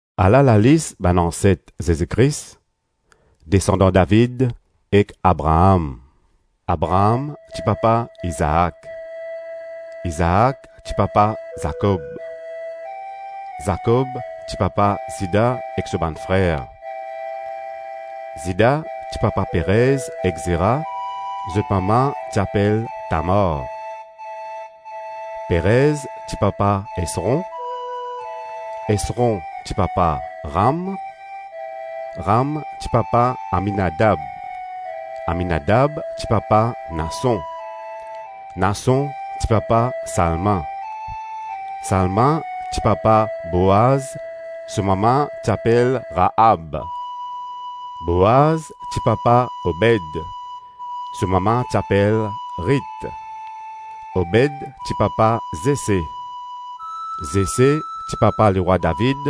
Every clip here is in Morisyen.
Ala lalis bann anset Zezi Kris, desandan David ek Abraam. Abraam ti papa Izaak. Izaak ti papa Zakob. Zakob ti papa Zida ek so bann frer. Zida ti papa Perez ek Zera, zot mama ti apel Tamar. Perez ti papa Esron. Esron ti papa Ram. Ram ti papa Aminadab. Aminadab ti papa Nason. Nason ti papa Salma. Salma ti papa Boaz, so mama ti apel Raab. Boaz ti papa Obed, so mama ti apel Rit. Obed ti papa Zese. Zese ti papa lerwa David.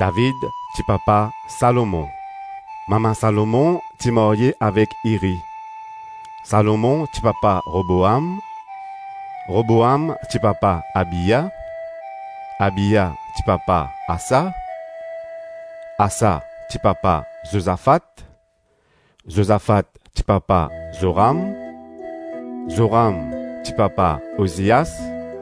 David ti papa Salomon. Mama Salomon ti marye avek Iri. Salomon ti papa Roboam. Roboam ti papa Abia. Abia ti papa Asa. Asa ti papa Zozafat. Zozafat ti papa Zoram. Zoram ti papa Ozias.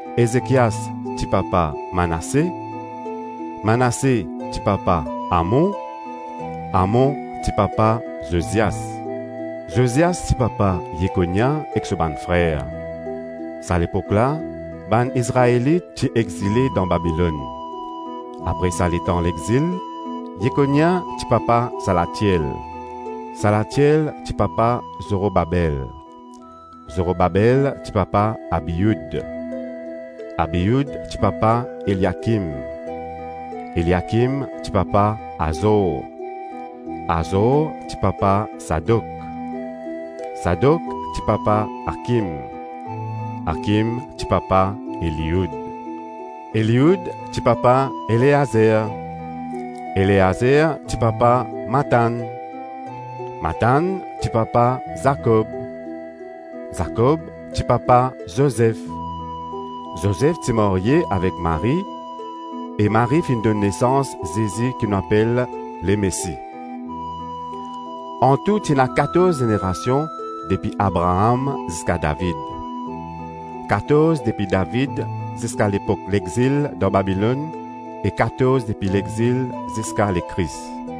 Ezekias ti papa Manase. Manase ti papa Amon. Amon ti papa Zozias. Zozias ti papa Yekonia ek so bann frer. Sa lepok la, bann Izraelit ti exile dan Babilonn. Apre sa letan lexil, Yekonia ti papa Salatiel. Salatiel ti papa Zorobabel. Zorobabel ti papa Abioud. Abioud ti papa Eliakim. Eliakim ti papa Azor. Azor ti papa Sadok. Sadok ti papa Akim. Akim ti papa Elioud. Elioud ti papa Eleazer. Eleazer ti papa Matann. Matann ti papa Zakob. Zakob ti papa Zozef. Zozef ti marye avek Marie, e Marie finn donn nesans Zezi ki nou apel Lemesi. Antou ti ena katorz zenerasion depi Abraam ziska David, Katorz depi David ziska lepok lexil dan Babilonn e katorz depi lexil ziska Lekris.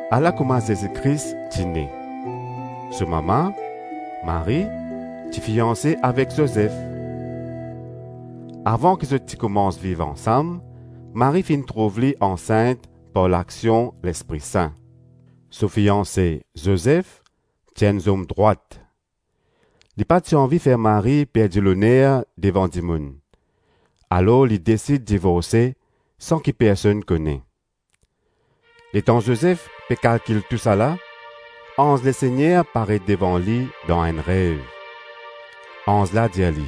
Ala kouma Zezi Kris ti ne. So mama Marie ti fianse avek Zozef. Avan ki zot ti koumans viv ansam Marie finn trouv li ansint par laksion Lespri Sin. So fianse, Zozef ti enn zom drwat. Li pa ti anvi fer Marie perdi loner devan dimoun, alor li desid divorse san ki personn kone. Letan Zozef pe kalkil tousala, anz Lesegner paret devan li dan enn rev. Anz la dir li,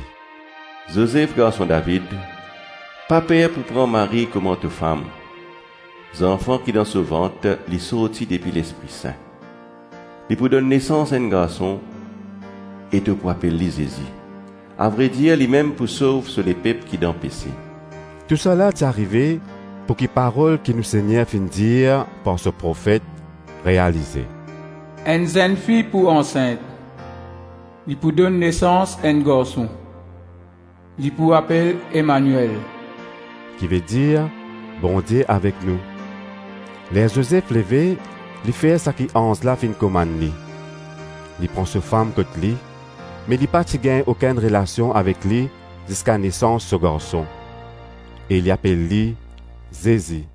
“Zozef, garson David, pa per pou pran Marie kouma to fam. Zanfan ki dan so vant li sorti depi Lespri Sin. Li pou donn nesans enn garson e to pou apel li Zezi. Avredir limem pou sov so lepep ki dan pese.” Tousala ti arive pouki parol ki nou Segner finn dir par so profet realize: “Enn zennfi pou ansint, li pou donn nesans enn garson. Li pou apel Emaniel,” ki vedir, ‘Bondie avek nou.’ Ler Zozef leve, li fer saki anz la finn komann li. Li pran so fam kot li, me li pa ti gagn okenn relasion avek li ziska nesans so garson. E li apel li Zezi.